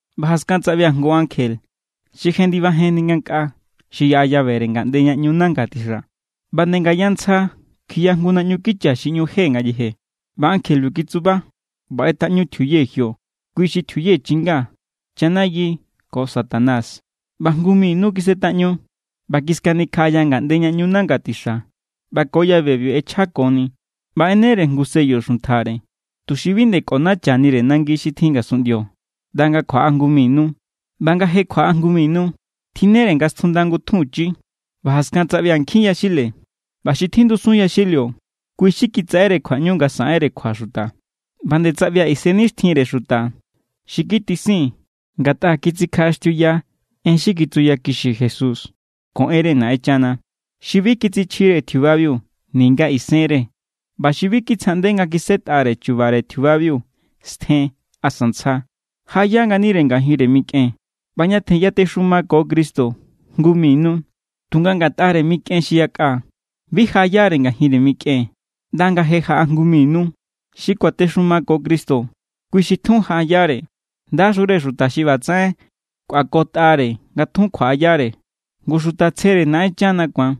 ꞌBa jaskan tsaꞌbia̱ jngu ankje xi jendibajenni ngankꞌaa xi yaꞌa llavere ngaꞌnde ña ꞌñu nanga tixa. ꞌBa nde ngaya tsja kjiꞌya jngu naꞌñu kicha xi ꞌñu je ngayeje. ꞌBa ankjebiu kitsuba ꞌba ꞌetaꞌñu tjiuye jio, kui= xi tjiuye chinga, chanayi ko Satanás, ꞌba jngu mi nu kisꞌetaꞌñu. ꞌBa kiskanikjaꞌaya ngaꞌnde ña ꞌñu nanga tixa ꞌba ko llavebiu ꞌechjakoni. ꞌBa ꞌenere jngu sello xuntjare, tuxi bi nde kꞌonachanire nangi xi tjin ngasunꞌndio ꞌnda nga kjuaꞌa jngu mi nu. ꞌBa nga je kjuaꞌa jngu mi nu, tjinnere nga stjunda ngutjunchi. ꞌBa jaskan tsaꞌbia̱ nkjin yaxile. ꞌBa xi tjindusun yaxilio, kui xi kitsaꞌere kjuaꞌñu nga saꞌenre kjua xuta. ꞌBa nde tsaꞌbia̱ isennixtjinre xuta xi kitisin ngatꞌa kitsikjaꞌaxtiuya en xi kitsuyakixi Jesús ko enre Naꞌenchana, xi bi kitsichjire tjiubabiu ninga isenre ꞌba xi bi kitsjaꞌnde nga kisꞌetꞌare chu̱ba̱re tjiubabiu stjen asa ntsja. Jaꞌaya nganire ngajinre mikꞌen ꞌba ñatjen yatexumako Cristo jngu mi nu. Tunga ngatꞌare mikꞌen xi yakꞌa, bi jaꞌayare ngajinre mikꞌen ꞌnda nga je jaꞌa jngu mi nu. Xi kuatexumako Cristo, kui xi tjun jaꞌayare. ¡Ndaxure xuta xi ꞌbatsaꞌen kꞌuakotꞌare nga tjun kjuaꞌayare! Ngu xuta tsjere Naꞌenchana ku̱an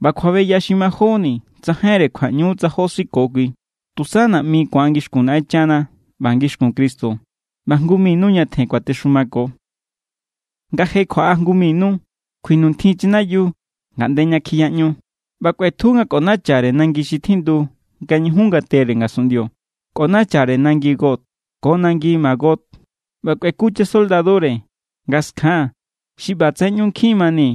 ꞌba kjuabeya xi majóni tsajainre kjuaꞌñu= tsa jó siko kui. Tusa naꞌmi ku̱an ngixkun Naꞌenchana ꞌba ngixkun Cristo, ꞌba jngu mi nu ñatjen kuatexumako. Nga je kjuaꞌa jngu mi nu, kjuinuntjin chanayiu ngaꞌnde ña kjiyaꞌñu. ꞌBa kꞌuetju nga kꞌonachare nangi xi tjindu nga ñujun ngatere ngasunꞌndio. Kꞌonachare nangi Gog ko nangi Magog ꞌba kꞌueku chasoldadure nga skjan xi ꞌbatsaꞌen ꞌñu nkjin mani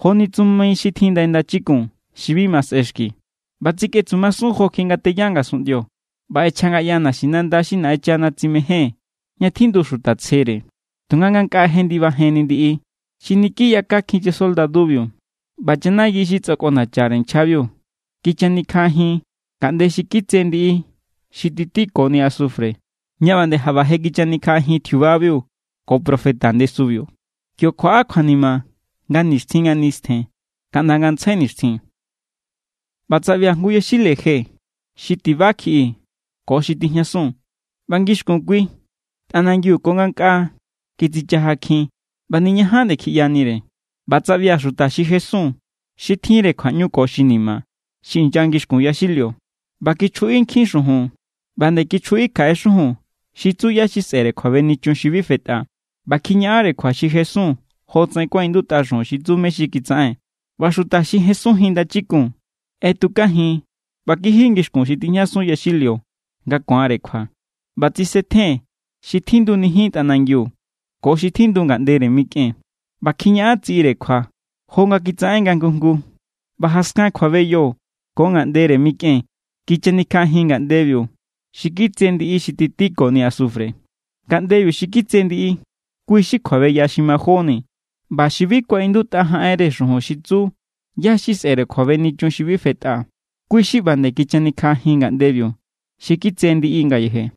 joni tsumi xi tjin ndai ndachikun xi bi ma sꞌexki. ꞌBa tsikꞌetsumasun jokjiꞌi nga teya ngasunꞌndio ꞌba ꞌechjangaꞌya naxinanda xi Naꞌenchana tsimején ña tjindu xuta tsjere. Tunga ngankꞌaa jendibajenni ndiꞌi xi niki yakakjin chasoldadubiu. ꞌBa chanayi xi tsakꞌonachare nchjabiu, kichanikjaꞌajin ngaꞌnde xi kitse ndiꞌi xi titikoni asufre, ña ꞌba nde jaꞌba je kichanikjaꞌajin tjiubabiu ko profeta ndesubiu. Kio kjuaꞌa kjuanima nga nixtjin nga nistjen kaꞌnda ngantsjai nixtjin. ꞌBa tsaꞌbia̱ jngu yaxile je xi tiba kjiꞌi ko xi tijñasun. ꞌBa ngixkun kui tꞌanangiu ko ngankꞌaa kitsichajakjin ꞌba niñajan nde kjiꞌyanire. ꞌBa tsaꞌbia̱ xuta xi jesun, xi tjinre kjuaꞌñu ko xi ni̱ma̱, xi inya ngixkun yaxilio. ꞌBa kichjuꞌi nkjin xujun, ꞌba nde kichjuꞌi kjaꞌe xujun xi tsu ꞌyá xi sꞌe̱re kjuabenichun xi bi fetꞌa. ꞌBa kjiñaꞌanre kjua xi jesun jotsaꞌen kuaꞌindutꞌa xujun xi tsu mé= xi kitsaꞌen. ꞌBa xuta xi jesunjin ndachikun ꞌetukajin ꞌba kiji ngixkun xi tjijñasun yaxilio nga ku̱anre kjua. ꞌBa tsisetjen xi tjindunijin tꞌanangiu ko xi tjindu ngaꞌndere mikꞌen. ꞌBa kjiñaꞌan tsiꞌire kjua jo nga kitsaꞌen nga jngu jngu. ꞌBa jaskan kjuabeyo ko ngaꞌndere mikꞌen kichanikjaꞌajin ngaꞌndebiu xi kitse ndiꞌi xi titikoni asufre. Ngaꞌndebiu xi kitse ndiꞌi, kui= xi kjuabeya xi majóni. ꞌBa xi bi kuaꞌindutꞌa jaꞌenre xujun xi tsu ꞌyá xi sꞌe̱re kjuabenichun xi bi fetꞌa, kui= xi ꞌba nde kichanikjaꞌajin ngaꞌndebiu xi kitse ndiꞌi ngayeje.